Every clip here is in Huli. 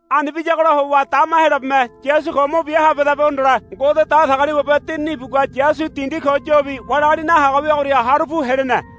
Ani biyagola howa dama Heyolabeme Yasu ko mo bia habehedabe hondole Ngode Datagaliwabe Dinini ibugua Yasu dindi ko yobi wali agali nahaga wiagoria haru pu helene.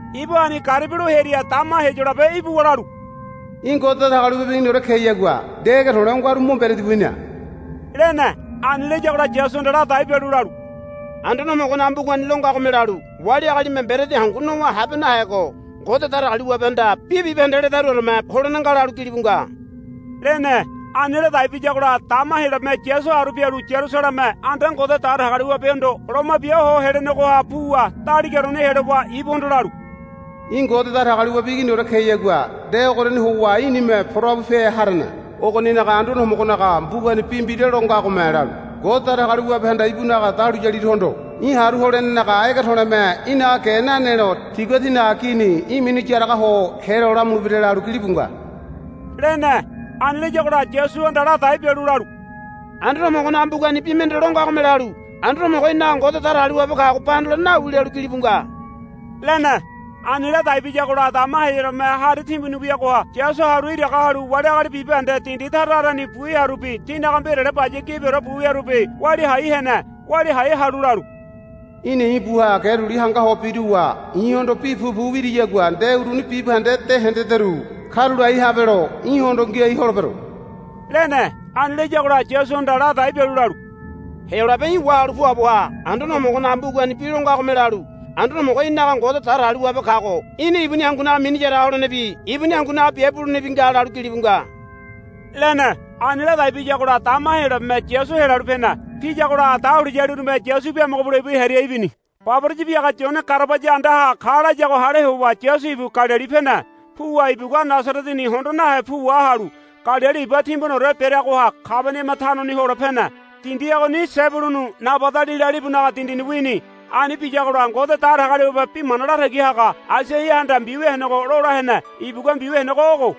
Ibu ani garibi lo hearia dama Heyolabe ibuwa lalu, Í̠ Ngode Datagaliwabe Iginiore keyagua nde ege to̱le̱ o ngaru mo mberedi bu hina, lene. Ani layagola Yasuhanda ladai bialu lalu, Anduane Homogonaga mbugani lo ngagome lalu, Wali agalime mberedi hangu nowa habe nahego Ngode Datagaliwabehanda bi bibahende ledaruoreme holene nga, lalu gilibu nga, lene. Ani ladai biyagola dama Heyolabeme Yasu haru pialu Yarusaleme anda Ngode Datagaliwabehondo loma bia ho helenegoha puwa daligaoreni helowa ibuhondo lalu, Í̠ Ngode Datagaliwabe Iginiore keyagua nde ogoriani howa í̠nime pora bupe harene. Ogoninaga Anduane Homogonaga mbugani bi mbira lo ngagome lalu, Ngode Datagaliwabehanda ibunaga dahuliyaliruhondo í̠ haru holenenaga ege to̱le̱me í̠naga ge nanelo tigua tinaga gini í̠ minu yaraga ho helo lamulebira, lalu gilibu nga, lene. Ani layagola Yasuhanda ladai bialu lalu, Anduane Homogonaga mbugani bi mende lo ngagome lalu, Anduane Homogo í̠naga Ngode Datagaliwabe kago ba hondolene nawi, lalu gilibu nga, lene. Ani ladai biyagola dama Heyolabeme hari timbuni weagoha Yasu haru iraga halu wali agali bibahende dindi tara tarani bu hearubi tinaga mbirale baya gibiore bu wiarubi walia hai hene. Walia hai halu lalu, Í̠na i̱ buha ge duli hanga ho biruwa i̱hondo bi pupu wiriyagua nde uruni bibahende de hendederu karulai habelo í̠hondo ngiai holebero, lene. Ani layagola Yasuhanda ladai bialu lalu, Heyolabe í̠ wahalu puabo ha. Anduane Homogonaga mbugani bi lo ngagome lalu, Anduane Homogo í̠naga Ngode Datagaliwabe kago í̠na ibuni hangunaga mini yaraga holenebi ibuni hangunaga biabe bulenebi nga, lalu gilibu nga, lene. Ani ladai biyagola dama Heyolabeme Yasu helalu pene. Piyagola dahuliyalirume Yasu biamogo bule ibu hearia ibini. Baboraya biaga Yone garabaya andaha ka layago hale howa Yasu ibu Galili pene. Puwa ibugua Nasareteni hondo nahe pu wahalu Galili iba timbuniore bereagoha Kabaniama tanoni hole pene. Dindi ogoni Sebulunu Nabadalila libunaga dindini wini. Ani biyagola Ngode Datagaliwabe bi mana latagi haga Aisaiahanda mbiwia henego lola hene. Ibugua mbiwia henego ogo,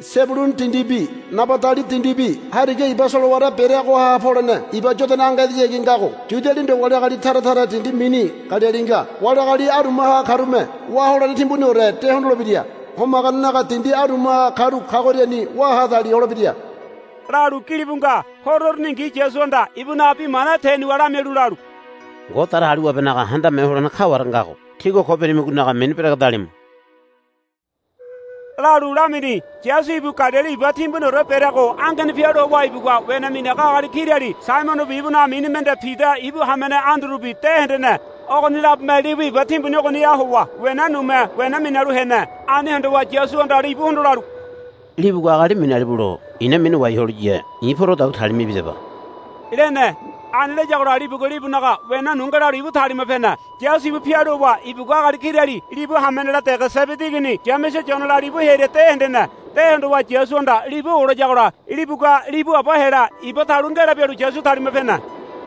Sebulunu dindibi Nabadali dindibi hariga iba solowara bereagoha polene Iba Yodana ange edehayagi ngago Yualinaga ndo wali agali tara taranaga dindi mini Galili nga. Wali agali arumaha karume wá holene timbuniore de hondolebira. Homaganenaga dindi arumaha karu kagoriani wá ha dali holebira, lalu gilibu nga. Horo uruningi Yasuhanda ibunaga bi mana tenuwa lamialu lalu, Ngode Datagaliwabenaga Handame Ho Holene kaware ngago tígua ko birimigonaga mini beregedalimu, lalu lamini. Yasu ibu Galili iba timbuniore bereago angeni pialu howa ibugua wena minaga agali kirali Saimonobi ibunaga mini mende Pida ibu hamene Andurubi de hendene. Ogoni labome libu iba timbuni ogoniha howa wena nume wena minalu hene. Ani hondowa Yasuhanda libuhondo lalu, Libugua agali minalibulo i̱na minawai holiya i̱ porodagua talima ibidaba, lene. Ani layagola libugua libunaga wena nu ngelalu ibu talima pene. Yasu ibu pialu howa ibugua agali kirali libu hamenela dege Sebedi igini Yamese Yonela libu hearia de hendene. De hondowa Yasuhanda libu olayagola libugua libu aba hela iba talu ngela bialu Yasu talima pene.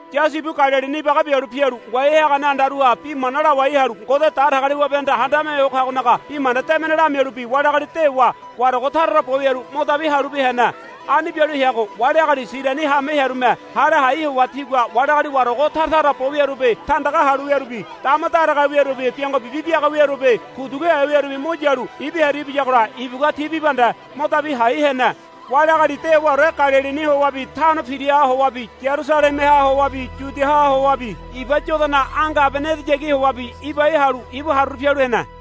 Yasu ibu Galilini ibaga bialu pialu ngoai hagane andaruha bi mana lawai halu Ngode Datagaliwabehanda Handame Ho Kagonaga Bi Mana Debene lamialubi wali agali dewa warago tara tara bo wiaru mo dabi halubi hene. Ani bialu heago wali agali Siriani haame hearume hale hai howa tigua wali agali warago tara tara bo wiarubi tandaga halu wiarubi dama daragahe wiarubi biango bibi biaga wiarubi kuduguhe wiarubi mo yalu ibu hearia ibiyagola ibugua ti bibahende mo dabi hai hene. Wali agali dewaore Galilini howabi Tano Piraha howabi Yarusalemeha howabi Yudiaha howabi Iba Yodana ange abene edehayagi howabi ibai halu ibu haruru pialu hene.